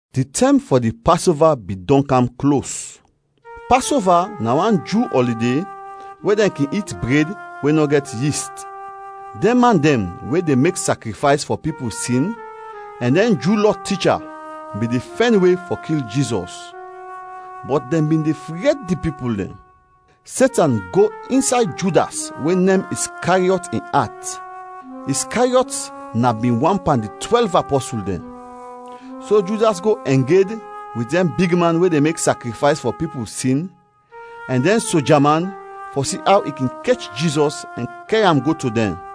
Di tɛm fɔ di Pasova bin dɔn kam klos. Pasova na wan Ju ɔlide we dɛn kin it bred we nɔ gɛt yist. Dɛn man dɛn we de mek sakrifays fɔ pipul sin ɛn dɛn Ju Lɔ ticha bin de fɛn we fɔ kil Jizɔs, bɔt dɛn bin de fred di pipul dɛn. Setan go insay Judas we nem Iskariɔt, in at; Iskariɔt na bin wan pan di twɛlv apɔsul dɛn. So Judas go ɛng ed wit dɛn bigman we de mek sakrifays fɔ pipul sin ɛn dɛn soja man fɔ si aw in kin kech Jizɔs ɛn kɛr am go to dɛn.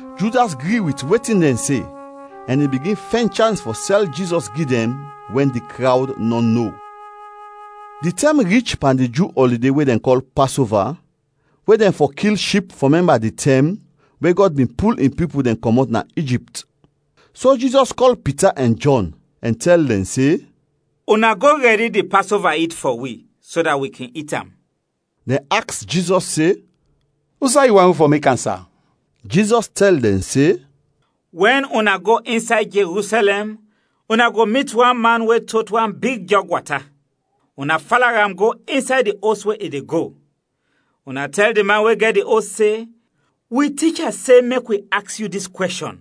Judas gri wit wetin dɛn se, ɛn i bigin fɛn chans fɔ sɛl Jizɔs gi dɛn wɛn di krawd nɔ no. Di tɛm rich pan di Ju ɔlide we dɛn kɔl Pasova we dɛn fɔ kil ship fɔ mɛmba di tɛm we Gɔd bin pul in pipul dɛn kɔmɔt na Ijipt. So Jizɔs kɔl Pita ɛn Jɔn, ɛn tɛl dɛn se, “Una go rɛdi di Pasova it fɔ wi, so dat wi kin it am.” Dɛn aks Jizɔs se, “Usay yu want wi fɔ mek am, sa?” Jizɔs tɛl dɛn se, “Wɛn una go insay Jerusɛlɛm, una go mit wan man we tot wan big jɔg wata. Una fala am go insay di os we i de go. Una tɛl di man we gɛt di os se, ‘Wi Ticha se mek wi aks yu dis kwɛshɔn: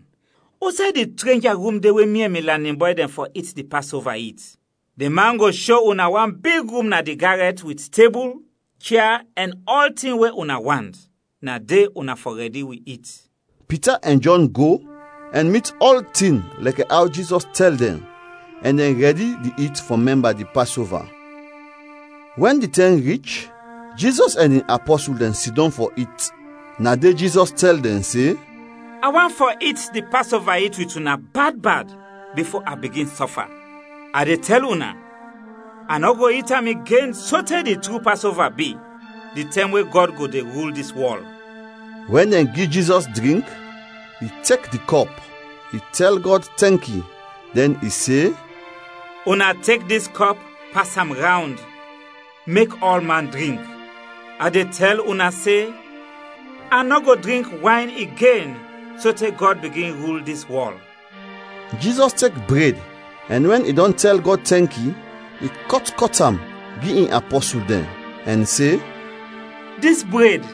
usay di trenja rum de we mi ɛn mi lanin bɔy dɛn fɔ it di Pasova it?’ Di man go sho una wan big rum na di garɛt wit tebul, chia ɛn ɔltin we una want, na de una fɔ rɛdi wi it.” Pita ɛn Jɔn go ɛn mit ɔltin lɛkɛ aw Jizɔs tɛl dɛn ɛn dɛn rɛdi di it fɔ mɛmba di Pasova. Wɛn di tɛm rich, Jizɔs ɛn in apɔsul dɛn sidɔm fɔ it. Na de Jizɔs tɛl dɛn se, “A want fɔ it di Pasova it wit una bad bad bifo a bigin sɔfa. A de tɛl una, a nɔ go it am igen sote di tru Pasova bi, di tɛm we Gɔd go de rul dis wɔl.” Wɛn dɛn gi Jizɔs drink, i tek di kɔp, i tɛl Gɔd tɛnki, dɛn i se, “Una tek dis kɔp pas am rawnd, mek ɔlman drink. A de tɛl una se, a nɔ go drink wayn igen sote Gɔd bigin rul dis wɔl.” Jizɔs tek bred ɛn wɛn i dɔn tɛl Gɔd tɛnki, i kɔt, kɔt am gi in apɔsul dɛn ɛn se, “Dis bred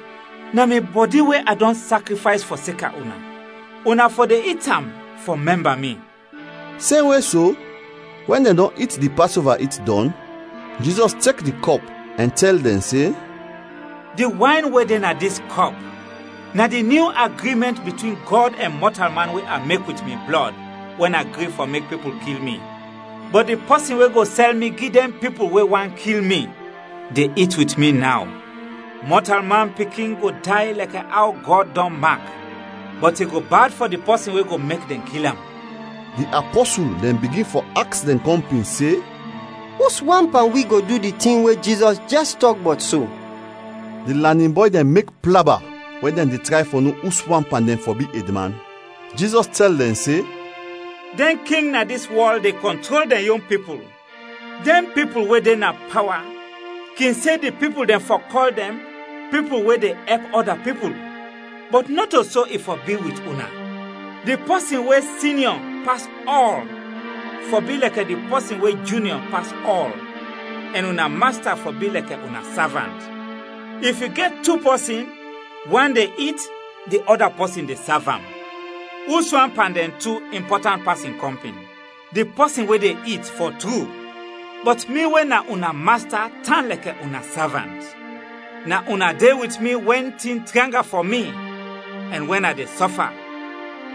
na mi bɔdi [we a dɔn sakrifays fɔseka una. Una fɔ de it am fɔ mɛmba mi.” Semwe so, wɛn dɛn dɔn it di Pasova it dɔn, Jizɔs tek di kɔp ɛn tɛl dɛn se, “Di wayn we de na dis kɔp na di nyu agrimɛnt bitwin Gɔd ɛn mɔtalman we a mek wit mi blɔd wɛn a gri fɔ mek pipul kil mi.] “Bɔt di pɔsin we go sɛl mi gi dɛn pipul we want kil mi, de it wit mi naw. Mɔtalman Pikin go day lɛkɛ aw Gɔd dɔn mak, bɔt i go bad fɔ di pɔsin we go mek dɛn kil am!” Di apɔsul dɛn bigin fɔ aks dɛn kɔmpin se, “Uswan pan wi go du di tin we Jizɔs jɛs tɔk bɔt so?” Di lanin bɔy dɛn mek plaba wɛn dɛn de tray fɔ no uswan pan dɛn fɔ bi edman. Jizɔs tɛl dɛn se, “Dɛn king na dis wɔl de kɔntrol dɛn yon pipul, dɛn pipul we de na pawa kin se di pipul dɛn fɔ kɔl dɛn ‘Pipul we de ɛp ɔda pipul.’ Bɔt nɔto so i fɔ bi wit una, di pɔsin we sinyɔ pas ɔl fɔ bi lɛkɛ di pɔsin we junyɔ pas ɔl ɛn una masta fɔ bi lɛkɛ una savant. If yu gɛt tu pɔsin, wan de it, di ɔda pɔsin de sav am, uswan pan dɛn tu impɔtant pas in kɔmpin? Di pɔsin we de it, fɔ tru. Bɔt mi we na una Masta tan lɛkɛ una savant. “Na una de wit mi wɛn tin tranga fɔ mi, ɛn wɛn a de sɔfa,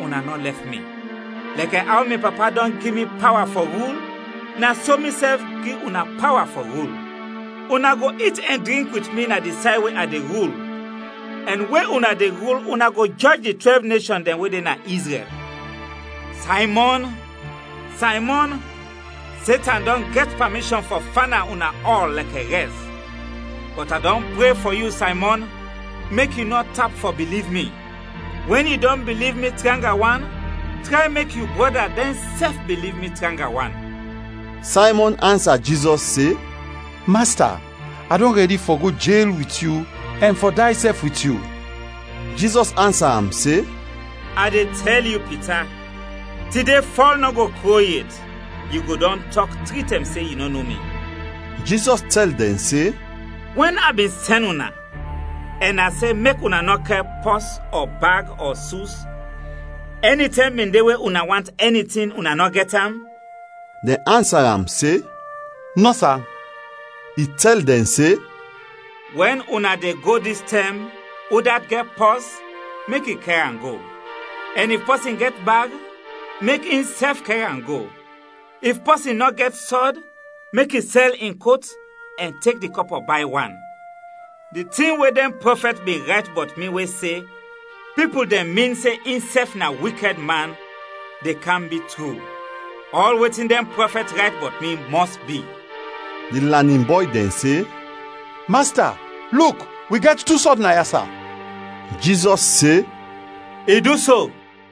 una nɔ lɛf mi. Lɛkɛ aw mi Papa dɔn gi mi pawa fɔ rul, na so misɛf gi una pawa fɔ rul. Una go it ɛn drink wit mi na di say we a de rul, ɛn we una de rul una go jɔj di twɛlv neshɔn dɛn we de na Izrɛl. “Saymɔn, Saymɔn, Setan dɔn gɛt pamishɔn fɔ fana una ɔl lɛkɛ rɛs. Bɔt a dɔn pre fɔ yu Saymɔn mek yu nɔ tap fɔ biliv mi. Wɛn yu dɔn biliv mi tranga wan, tray mek yu brɔda dɛnsɛf biliv mi tranga wan.” Saymɔn ansa Jizɔs se, “Masta, a dɔn rɛdi fɔ go jel wit yu ɛn fɔ day sɛf wit yu.” Jizɔs ansa am se, “A de tɛl yu, Pita, tide fɔl nɔ go kro yet, yu go dɔn tɔk tri tɛm se yu nɔ no mi.” Jizɔs tɛl dɛn se, “Wɛn a bin sɛn una ɛn a se mek una nɔ kɛr pɔs, ɔ bag, ɔ sus, ɛnitɛm bin de we una want ɛni tin, una nɔ gɛt am?” Dɛn ansa am se, “Nɔ, sa.” I tɛl dɛn se, “Wɛn una de go dis tɛm, udat gɛt pɔs, mek i kɛr am go; ɛn if pɔsin gɛt bag, mek insɛf kɛr am go. If pɔsin nɔ gɛt sɔd, mek i sɛl in kot ɛn tek di kɔpɔ bay wan. Di tin we dɛn prɔfɛt bin rayt bɔt mi we se, ‘Pipul dɛn min se insɛf na wikɛd man,’ de kam bi tru. Ɔl wetin dɛn prɔfɛt rayt bɔt mi mɔs bi.” Di lanin bɔy dɛn se, “Masta, luk, wi gɛt tu sɔd naya, sa.” Jizɔs se, “I du so!”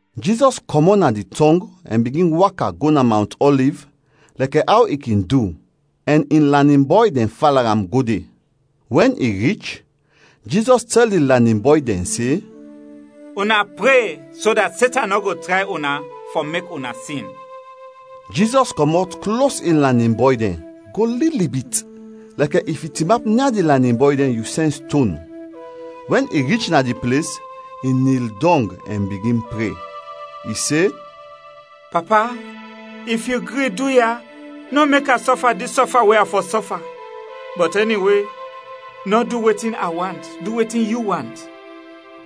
Jizɔs kɔmɔt na di tɔng ɛn bigin waka go na Mawnt Ɔliv lɛkɛ aw i kin du ɛn in lanin bɔy dɛn fala am go de. Wɛn i rich, Jizɔs tɛl di lanin bɔy dɛn se, “Una pre so dat Setan nɔ go tray una fɔ mek una sin.” Jizɔs kɔmɔt klos in lanin bɔy dɛn, go lili bit, lɛkɛ if yu tinap nia di lanin bɔy dɛn, yu sɛn ston. Wɛn i rich na di ples, i nil dɔng ɛn bigin pre, i se, “Papa, if yu gri, duya, nɔ mek a sɔfa dis sɔfa we a fɔ sɔfa, bɔt ɛniwe, nɔ du wetin a want, du wetin yu want.” [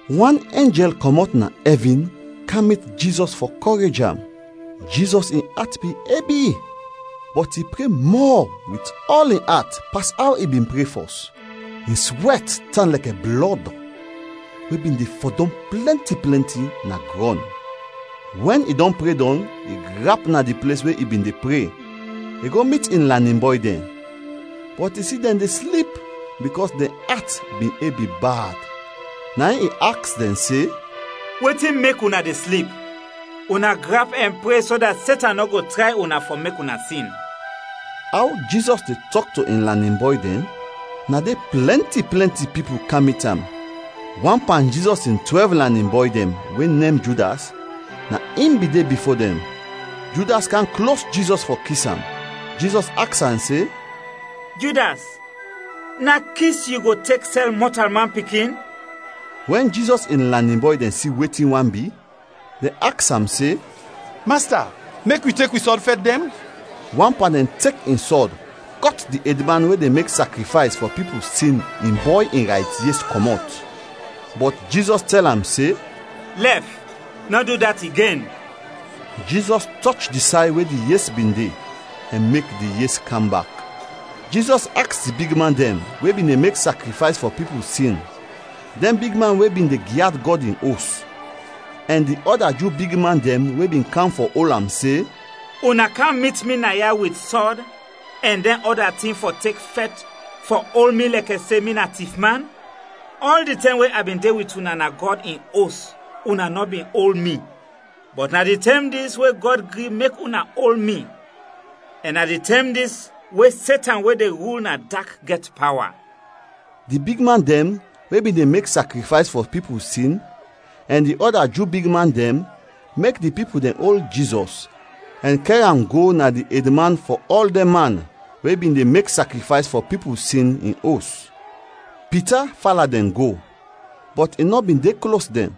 Wan enjɛl kɔmɔt na ɛvin kam mit Jizɔs fɔ kɔrej am. Jizɔs in at bin ebi, bɔt i pre mɔ wit ɔl in at pas aw i bin pre fɔs; in swɛt kam tan lɛkɛ blɔd, we bin de fɔdɔm plɛnti plɛnti na grɔn.] Wɛn i dɔn pre dɔn, i grap na di ples we i bin de pre, i go mit in lanin bɔy dɛn, bɔt i si dɛn de slip bikɔs dɛn at bin ebi bad. Na in i aks dɛn se, “Wetin mek una de slip? Una grap ɛn pre so dat Setan nɔ go tray una fɔ mek una sin.” Aw Jizɔs de tɔk to in lanin bɔy dɛn, na de plɛnti, plɛnti pipul kam mit am. Wan pan Jizɔs in twɛlv lanin bɔy dɛn we nem Judas na in bin de bifo dɛn. Judas kam klos Jizɔs fɔ kis am. Jizɔs aks am se, “Judas, na kis yu go tek sɛl Mɔtalman Pikin?” Wɛn Jizɔs in lanin bɔy dɛn si wetin want bi, dɛn aks am se, “Masta, mek wi tek wi sɔd fɛt dɛn?” Wan pan dɛn tek in sɔd, kɔt di edman we de mek sakrifays fɔ pipul sin in bɔy in rayt yes kɔmɔt. Bɔt Jizɔs tɛl am se, “Lɛf! Nɔ du dat igen!” Jizɔs tɔch di say we di yes bin de ɛn mek di yes kam bak. Jizɔs aks di bigman dɛn we bin de mek sakrifays fɔ pipul sin, dɛn bigman we bin de gyad Gɔd in Os, ɛn di ɔda Ju bigman dɛn we bin kam fɔ ol am se, “Una kam mit mi naya wit sɔd ɛn dɛn ɔda tin fɔ tek fɛt fɔ ol mi lɛkɛ se mi na tifman? Ɔl di tɛm we a bin de wit una na Gɔd in Os una nɔ bin ol mi. Bɔt na di tɛm dis we Gɔd gri mek una ol mi ɛn na di tɛm dis we Setan we de rul na dak gɛt pawa.” Di bigman dɛn we bin de mek sakrifays fɔ pipul sin ɛn di ɔda Ju bigman dɛn mek di pipul dɛn ol Jizɔs ɛn kɛr am go na di edman fɔ ɔl dɛn man we bin de mek sakrifays fɔ pipul sin, in os. Pita fala dɛn go, bɔt i nɔ bin de klos dɛn.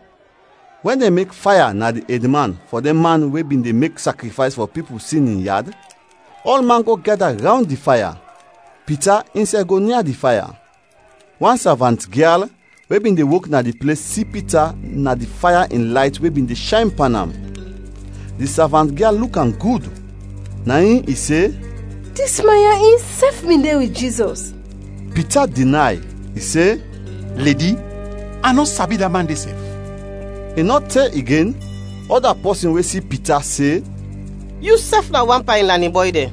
Wɛn dɛn mek faya na di edman fɔ dɛn man we bin de mek sakrifays fɔ pipul sin in yad, ɔlman go gɛda rawnd di faya; Pita insɛf go nia di faya. Wan savant-gyal we bin de wok na di ples si Pita na di faya in layt we bin de shayn pan am, di savant-gyal luk am gud, na in i se, “Dis man ya insɛf bin de wit Jizɔs.” Pita dinay, i se, “Ledi, a nɔ sabi da man de sɛf!” I nɔ te igen, ɔda pɔsin we si Pita, se, “Yusɛf na wan pan in lanin bɔy dɛn.”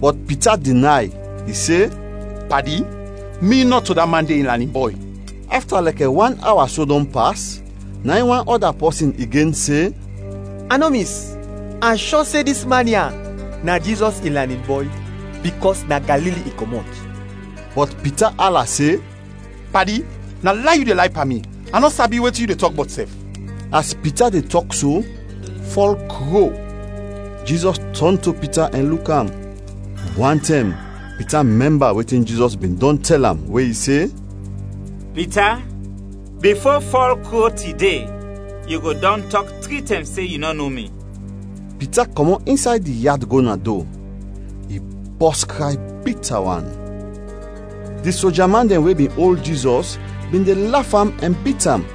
Bɔt Pita dinay. I se, “Padi, mi nɔto da man de in lanin bɔy.” Afta lɛkɛ wan awa so dɔn pas, na in wan ɔda pɔsin igen se, “A nɔ mis, a shɔ se dis man ya na Jizɔs in lanin bɔy bikɔs na Galili i kɔmɔt.” Bɔt Pita ala se, “Padi, na lay yu de lay pan mi, a nɔ sabi wetin yu de tɔk bɔt sɛf.” As Pita de tɔk so, fɔl kro. Jizɔs tɔn to Pita ɛn luk am. Wantɛm Pita mɛmba wetin Jizɔs bin dɔn tɛl am we i se, “Pita, bifo fɔl kro tide, yu go dɔn tɔk tri tɛm se yu nɔ no mi.” Pita kɔmɔt insay di yad go na do; i bɔs kray bita wan. Di soja man dɛn we bin ol Jizɔs bin de laf am ɛn bit am.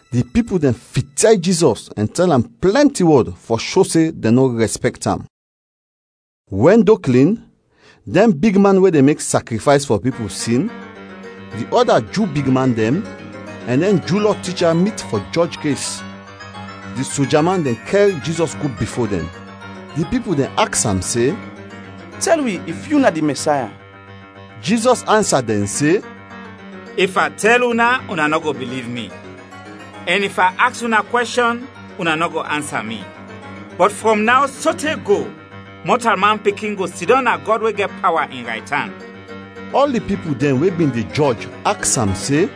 Di pipul dɛn fityay Jizɔs ɛn tɛl am plɛnti wɔd fɔ sho se dɛn nɔ rɛspɛkt am. Wɛn do klin, dɛn bigman we de mek sakrifays fɔ pipul sin, di ɔda Ju bigman dɛn, ɛn dɛn Ju Lɔ ticha mit fɔ jɔj kes. Di soja man dɛn kɛr Jizɔs go bifo dɛn, di pipul dɛn aks am se, “Tɛl wi if yu na di Mɛsaya?” Jizɔs ansa dɛn se, “If a tɛl una, una nɔ go biliv mi, ɛn if a aks una kwɛshɔn, una nɔ go ansa mi. Bɔt frɔm naw sote go, Mɔtalman Pikin go sidɔm na Gɔd we gɛt pawa, in raytan.” Ɔl di pipul dɛn we bin de jɔj aks am se,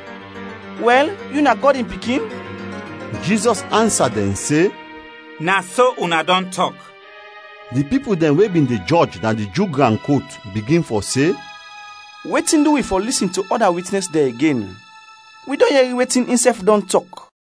“Wɛl, yu na Gɔd in Pikin?” Jizɔs ansa dɛn se, “Na so una dɔn tɔk.” Di pipul dɛn we bin de jɔj na di Ju gran kot bigin fɔ se, “Wetin du wi fɔ lisin to ɔda witnɛs dɛn igen? Wi dɔn yɛri wetin insɛf dɔn tɔk.”